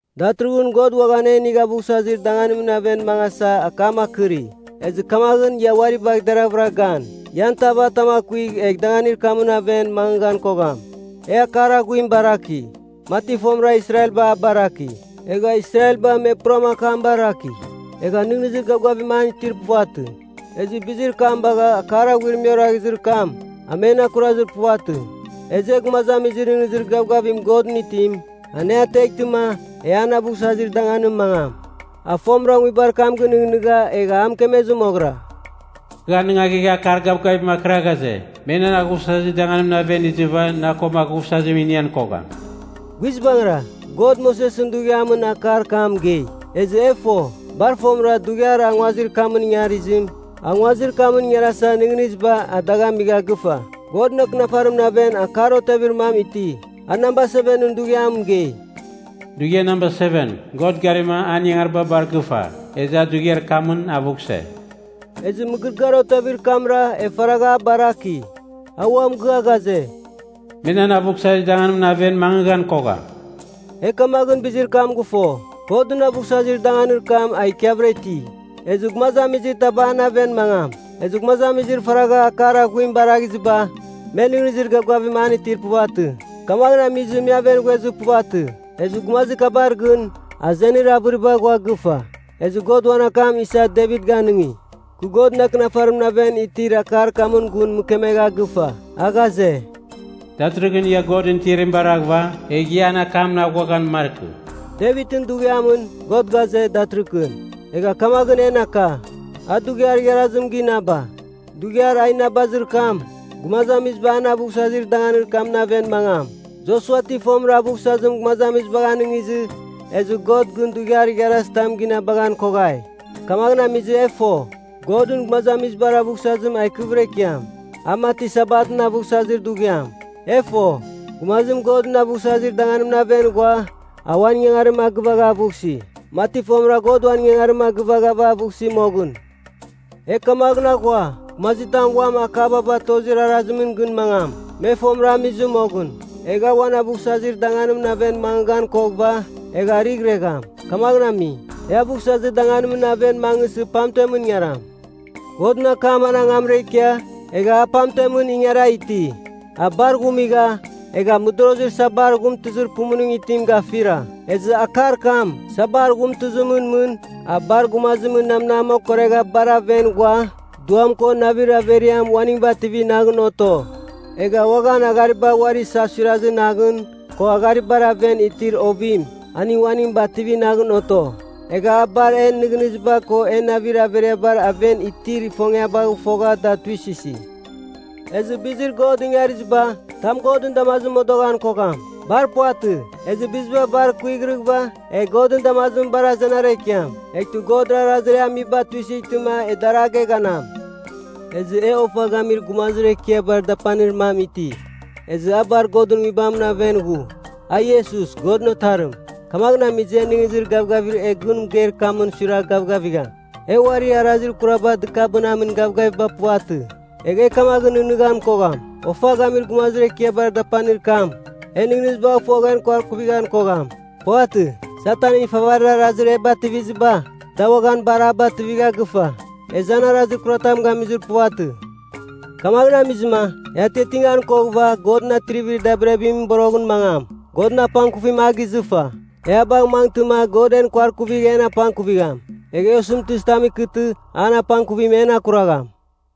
Datɨrɨghɨn, God uaghan e inigh aghuvsazir danganimɨn aven mangasa akam akɨri. Ezɨ kamaghɨn ia uari bagh deravɨra gan, ian tav atam akuigh egh danganir kamɨn aven mangɨghan kogham. E Akar Aghuim baraki, mati fomɨra Israelba a baraki. Egha Israelba me puram akam a baraki, egha nɨghnɨzir gavgavim an itir puvatɨ. Ezɨ bizir kam bagha akar aghuir me oraghizir kam, a men akurazir puvatɨ. Ezɨ e gumazamizir nɨghnɨzir gavgavim Godɨn itim, an e ateghtɨma e an aghuvsazir danganimɨn mangam. A fomɨra nguibar kam gɨnɨghnɨgha egha a mɨkemezir moghɨra, “Kɨ anɨngaghegha akar gavgavim akɨra ghaze, ‘Me nan aghuvsazir danganimɨn aven izɨva na ko aghuvsazim inian kogham.’” Guizbangɨra, God Mosesɨn dughiamɨn akar kam mɨgei, ezɨ e fo, bar fomɨra dughiar a nguazir kamɨn ingarizim, a nguazir kamɨn ingarasa nɨghnɨziba a dagh amigha gɨfa. Godɨn Akɨnafarimɨn aven akar otevir mam iti, a namba sevenɨn dughiam mɨgei, “Dughiar namba seven, God garima an ingangariba bar gɨfa, ezɨ a dughiar kamɨn avughse.” Ezɨ mɨgɨrɨgɨar otevir kamra e faragha a baraki, a ua mɨgɨa ghaze, “Me nan aghuvsazir danganimɨn aven mangɨghan kogham.” E kamaghɨn bizir kam gɨfo, Godɨn aghuvsazir danganir kam a ikiavɨra iti, ezɨ gumazamizir taba an aven mangam. Ezɨ gumazamizir faragha Akar Aghuim baraghiziba, me nɨghnɨzir gavgavim an itir puvatɨ, kamaghɨn amizɨ me aven ghuezir puvatɨ. Ezɨ gumazir kabar gɨn, azenir avɨriba ghua gɨfa, ezɨ God uan akam isa Devit ganɨngi, kɨ Godɨn Akɨnafarimɨn aven itir akar kamɨn gun mɨkemegha gɨfa. A ghaze, “Datɨrɨghɨn ia Godɨn tiarim baraghɨva, egh ia an akamɨn aghuaghan markɨ.” Devitɨn dughiamɨn, God ghaze, “Datɨrɨghɨn,” egha kamaghɨn en aka, a dughiar igharazim ginaba. Dughiar a inabazir kam, gumazamiziba an aghuvsazir danganir kamɨn aven mangam. Josua ti fomɨra aghuvsazim gumazamizibagh anɨngizɨ, ezɨ God gɨn dughiar igharazitam ginabaghan koghai. Kamaghɨn amizɨ e fo, Godɨn gumazamizibar aghuvsazim a ikɨvɨra ikiam, a mati Sabatɨn aghuvsazir dughiam. E fo, gumazim Godɨn aghuvsazir danganimɨn aven ghua, a uan ingangarim a gɨvagha aghuvsi, mati fomɨra God uan ingangarim a gɨvaghava aghuvsi moghɨn. E kamaghɨn aghua, gumazitam uam akaba batozir arazimɨn gɨn mangam, me fomɨra amizɨ moghɨn, egh a uan aghuvsazir danganimɨn aven mangɨghan koghɨva, egh arɨghiregham. Kamaghɨn ami e aghuvsazir danganimɨn aven mangɨsɨ pamtemɨn ingaram. Godɨn Akam an angamra ikia, egha a pamtemɨn ingara iti. A bar ghumigha, egha a mɨdorozir sabar ghumtɨzir pumuning itim gafira. Ezɨ akar kam, sabar ghumtɨzimɨn mɨn, a bar gumazimɨn namnam okoregha bar aven ghua, duam ko navir averiam uaning bativi naghɨn oto, egha uaghan aghariba uari isasurazir naghɨn, ko agharibar aven itir ovim, aning uaning bativi naghɨn oto. Egha a bar en nɨghnɨziba ko en navir averibar aven itir ifongiabagh fogha da tuisɨsi. Ezɨ bizir God ingariziba, tam Godɨn damazimɨn modoghan kogham. Bar puvatɨ. Ezɨ biziba bar kuighrɨghɨva egh Godɨn damazimɨn bar azenara ikiam. Eghtɨ Godra arazir e amiba tuisɨghtɨma e dar a geghanam. Ezɨ e Ofa Gamir Gumazir Ekiabar Dapanir mam iti, ezɨ a bar Godɨn Nguibamɨn aven ghu. A Iesus, Godɨn Otarim. Kamaghɨn amizɨ, e nɨghnɨzir gavgavir e gun mɨgeir kamɨn suiragh gavgavigham. E uari arazir kuraba dɨkabɨnamin gavgaviba puvatɨ. Egh e kamaghɨn nɨghnɨghan kogham, Ofa Gamir Gumazir Ekiabar Dapanir kam, en nɨghnɨzibagh fogh en kuarkuvighan kogham. Puvatɨ. Satanɨn ifavarir arazir e bativiziba, da uaghan bar a bativigha gɨfa. Ezɨ an arazir kuratam gamizir puvatɨ. Kamaghɨn amizɨma, e atiatingan koghɨva Godɨn atrivir dabirabimɨn boroghɨn mangam, Godɨn apangkuvim a gizɨfa. E a bagh mangɨtɨma God en kuarkuvigh en apangkuvigham. Egh e osɨmtɨzitam ikɨtɨ an apangkuvim en akuragham.